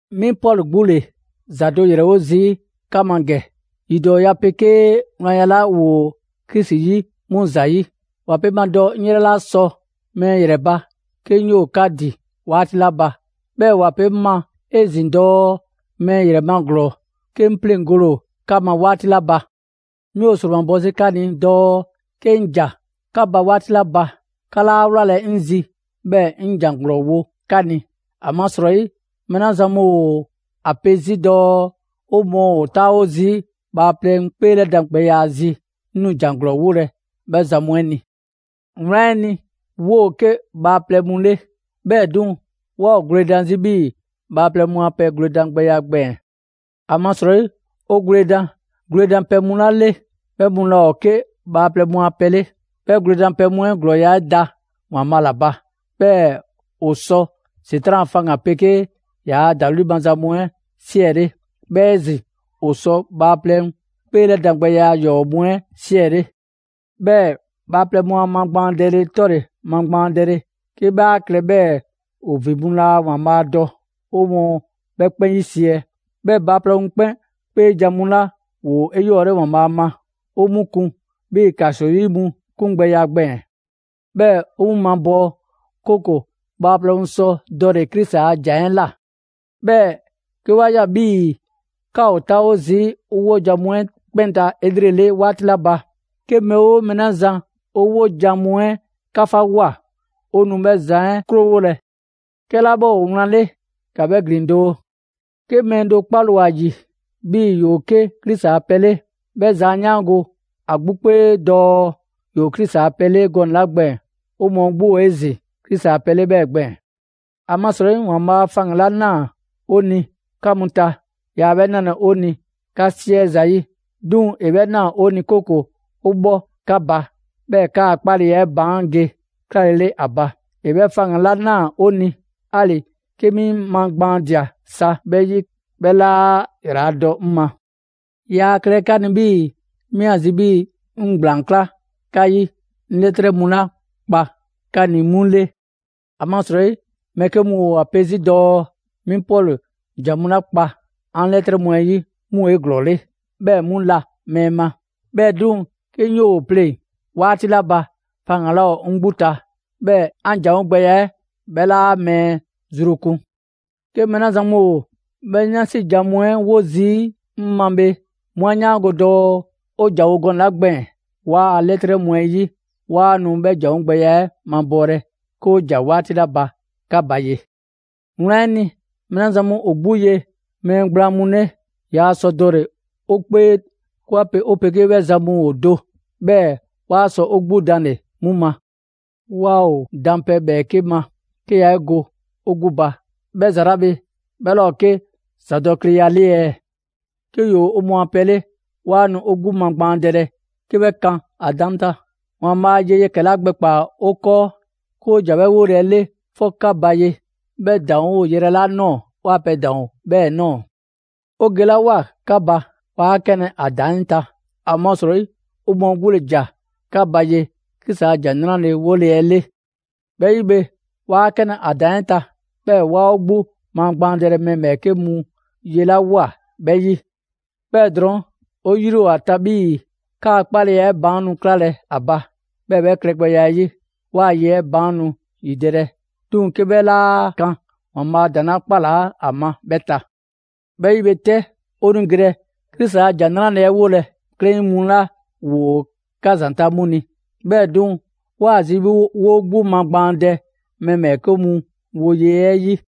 'Mi Pɔlu 'gbu ‑le ‑za do ‑yrɛwo' zii' 'ka ma ‑gɛ, ‑yidɔɔya 'pegee wlanya 'la ‑woo Krisi 'yi 'mu ‑zayi'. ‑Wa pe 'ŋ ma dɔɔ 'ŋ 'yrɛ 'laa sɔ mɛɛ ‑yrɛ ba 'ke 'ŋ 'yoo‑ 'ka ‑din 'waati 'la ba, 'bhɛɛ‑ ‑wa pe 'ŋ ma 'ezin‑ dɔɔ mɛɛ ‑yrɛ ma ‑glɔɔ, 'ke 'ŋ 'pleŋgole ‑o 'ka ma 'waati 'la ba. 'Mi ‑o ‑sromabɔ 'zi 'ka ni dɔɔ 'ke 'ŋ ‑ja 'ka ba 'waati 'la ba, 'ka 'laa 'wlalɛ‑ 'ŋ zi 'bhɛɛ‑ 'ŋ ‑jan ‑glɔɔ wo 'ka ni. ‑Amasrɔyi mɛɛ 'la zan mu ‑o ‑a pe 'zi dɔɔ 'o mɔɔ ‑o 'taawo zii' bhaaplɛŋ 'kpeelɛdan gbɛya zi, 'ŋ nu ‑jan ‑glɔɔ 'wolɛ‑ 'bhɛ zan mu 'ɛ ni. Wlan 'ɛ ni, 'woo‑ 'ke bhaaplɛŋ mu 'le; 'bhɛɛ‑ 'duŋ‑, 'waa ‑o gwledan 'zi 'bhii‑ bhaaplɛŋ mu a pɛ gwledan gbɛya 'ɛ gbɛɛn‑. ‑Amasrɔyi 'o gwledan gwledanpɛ mu 'la 'le, 'bhɛ mu laa ‑o 'ke bhaaplɛŋ mu a pɛ 'le. 'Bhɛ gwledanpɛ mu 'ɛ ‑glɔɔya' 'ɛ da ‑Waanbhaa' ‑la ba, 'bhɛɛ‑ ‑o sɔ ‑Setran' a faŋgan‑ 'ɛ 'pegee ‑yaa' ‑dawli' maza mu 'ɛ 'siɛle. 'Bhɛɛ‑ 'ezin‑ ‑o sɔ bhaaplɛŋ 'kpeelɛdangbɛya ‑yɔɔ' mu 'ɛ 'siɛle. 'Bhɛɛ‑ bhaaplɛŋ mu a magbaandɛle 'tɔle‑ magbaandɛle 'ke 'bhɛ a klɛ 'bhɛɛ‑ ‑o ‑vin mu laa ‑Waanbhaa' dɔ, 'o mɔɔ 'bhɛ 'kpɛn 'yisiɛ‑. 'Bhɛɛ‑ bhaaplɛŋ mu 'kpeejan‑ mu 'la ‑woo 'eyɔɔle ‑Waanbhaa' ma, 'o 'mu kun 'bhii‑ ‑kaso 'yi mu 'kungbɛya gbɛɛn‑; 'bhɛɛ 'o 'mu mabɔɔ, 'kooko‑ bhaaplɛŋ sɔ dɔle‑ Krisi a ‑jan 'ɛ ꞊la. 'Bhɛɛ‑ 'ke 'wa ꞊ya 'bhii‑ 'ka ‑o 'taawo zii' 'o 'wojan‑ mu 'ɛ 'kpɛn ta 'elrele 'waati 'la ba, 'ke mɛɛ 'oo mɛɛ 'la zan 'o 'wojan‑ mu 'ɛ 'kafawoa; 'o nu 'bhɛ zan 'ɛ 'krowolɛ. 'Kɛla 'bhɛ ‑o wlan 'le ‑ka 'bhɛ ‑glin doo! 'Ke mɛɛ do 'kpale‑ ‑o ‑a ‑yi 'bhii‑ ‑yoo 'ke Krisi a pɛ 'le, 'bhɛ zan 'a 'yaango‑ ‑a 'gbu 'kpee dɔɔ ‑yoo Krisi a pɛ 'le gɔnɛ‑ 'la gbɛɛn‑, 'o mɔɔ 'gbu ‑o 'ezin‑ Krisi a pɛ 'le 'bhɛɛ‑ gbɛɛn‑. ‑Amasrɔyi ‑Waanbhaa' faŋgan‑ 'la ꞊naa 'o ni 'ka mu ta, yaa 'bhɛ 'nalɛ‑ 'o ni 'ka 'siɛ zayi', 'duŋ‑ ‑e 'bhɛ ꞊naa 'o ni 'kooko‑ 'o 'bhɔ 'ka ba, 'bhɛɛ‑ 'kaa‑ 'kpaleya 'ɛ baan' ge 'klalele ‑a ba. ‑E 'bhɛ faŋgan‑ 'la ꞊naa 'o ni, 'ali‑ 'ke 'mi 'ŋ magbaandia sa 'bhɛ 'yi, 'bhɛ 'laa ‑yraladɔ 'ŋ ma. Yaa klɛlɛ 'ka ni 'bhii‑ 'mi ‑a zi 'bhii‑ 'ŋ ‑gblaan 'kla 'ka 'yi 'ŋ 'lɛtrɛ mu 'la kpa 'ka ni 'mu 'le. ‑Amasrɔyi mɛɛ 'ke mu ‑o ‑a pe 'zi dɔɔ 'mi Pɔlu ‑jan mu 'la kpa 'an 'lɛtrɛ mu 'ɛ 'yi 'mu ‑o 'eglɔɔle, 'bhɛɛ‑ 'mu la mɛɛ ma; 'bhɛɛ‑ 'duŋ‑ 'ke 'ŋ ‑yoo ‑o 'pleŋ‑ 'waati 'la ba, faŋgan‑ 'laa ‑o 'ŋ 'gbu ta, 'bhɛɛ‑ 'an ‑janwo' gbɛya 'ɛ 'bhɛ 'laa mɛɛ zru kun. 'Ke mɛɛ 'la zan mu ‑o 'bhɛ 'yansi jan mu 'ɛ wo zii' 'mi ma bhe, 'mu 'a 'yaango‑ dɔɔ 'o ‑janwo' gɔnɛ‑ 'la gbɛɛn‑ 'waa‑ 'lɛtrɛ mu 'ɛ 'yi, 'waa nu 'bhɛ ‑janwo' gbɛya 'ɛ mabɔɔlɛ 'ke 'o ‑ja 'waati 'la ba 'ka ba ye. Wlan 'ɛ ni, mɛɛ 'la zan mu ‑o 'gbu ye mɛɛ gblaan mu 'le, yaa sɔ dɔle‑ 'o mɔɔ 'kpee 'ke 'wa pe 'o 'pegee 'bhɛ zan mu ‑o do, 'bhɛɛ‑ 'waa sɔ 'o 'gbu danle‑ 'mu ma. Waa ‑o dan pɛ ‑bhɛɛke' ma, 'ke yaa 'e go ‑o 'gbu ba; 'bhɛ ‑za 'la bhe 'bhɛ 'laa ‑o 'ke ‑zadɔkleya 'le ɛɛ? 'Ke ‑yoo 'o mɔɔ a pɛ 'le, 'waa nu 'o 'gbu magbaandɛlɛ, 'ke 'bhɛ kan ‑a ‑daŋ' 'ɛ ta. ‑Waanbhaa' ye yɛkɛ‑ 'la gbɛkpaa‑ 'o 'kɔɔ 'ke 'o ‑ja 'bhɛ 'wole‑ 'ɛ 'le 'fɔ 'ka ba ye, 'bhɛ ‑daŋ' ‑o yrɛ 'la ꞊nɔɔ, 'waa‑ pɛ 'ɛ ‑daŋ' ‑o 'bhɛɛ‑ ꞊nɔɔ. 'O gelawoa 'ka ba, 'waa 'kanlɛ‑ 'o ‑daŋ' 'ɛ ta; ‑amasrɔyi 'o mɔɔ 'gbu ‑le ‑ja 'ka ba ye Krisi a ‑Jan 'Nrale‑ 'wole‑ 'ɛ 'le. 'Bhɛ 'yi bhe, 'waa 'kanlɛ‑ 'o ‑daŋ' 'ɛ ta, 'bhɛɛ‑ 'waa 'o 'gbu magbaandɛlɛ mɛɛ ‑bhɛɛke' mu ye 'la ꞊woa 'bhɛ 'yi. 'Bhɛɛ‑ drɔɔn' 'o 'yri ‑o ‑a ta 'bhii‑ 'kaa‑ 'kpaleya 'ɛ baan' nu 'klalɛ‑ ‑a ba, 'bhɛɛ‑ 'bhɛ klɛgbɛya 'ɛ 'yi, 'waa‑ ye 'ɛ baan' nu ‑yidɛlɛ, 'duŋ‑ 'ke 'bhɛ 'laa kan ‑Waanbhaa' ‑daŋ' 'la 'kpalaa 'a ma 'bhɛ ta. 'Bhɛ 'yi bhe 'tɛ, 'o nu gelɛ Krisi a ‑Jan 'Nrale‑ 'ɛ 'wolɛ‑ 'klɛɛn mu 'la ‑woo 'ka ‑zanta' 'mu 'yi. 'Bhɛɛ‑ 'duŋ‑, 'waa‑ zi 'bhii‑ 'woo 'gbu magbaandɛ mɛɛ ‑bhɛɛke' mu 'woye‑ 'ɛ 'yi.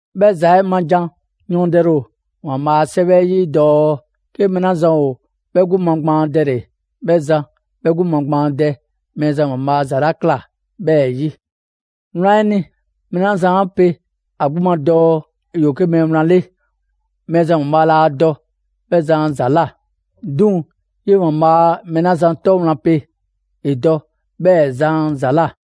'Bhɛ ‑za 'ɛ ma jan yɔɔndɛle ‑o ‑Waanbhaa' ‑a 'Sɛwɛ 'ɛ 'yi dɔɔ: «'Ke mɛɛ 'la zan ‑o 'bhɛ 'gbu magbaandɛle, 'bhɛ zan 'bhɛ 'gbu magbaandɛ Mɛɛzan ‑Waanbhaa' ‑za 'la ꞊kla 'bhɛɛ‑ 'yi.» Wlan 'ɛ ni, mɛɛ 'la zan 'a pe ‑a 'gbu ma dɔɔ ‑yoo 'ke mɛɛ wlan 'le, Mɛɛzan ‑Waanbhaa' laa dɔ 'bhɛ zan a ‑za ꞊la; 'duŋ‑ 'yee‑ ‑Waanbhaa' mɛɛ 'la zan 'tɔ wlan pe, ‑e dɔ 'bhɛɛ‑ zan a ‑za ꞊la.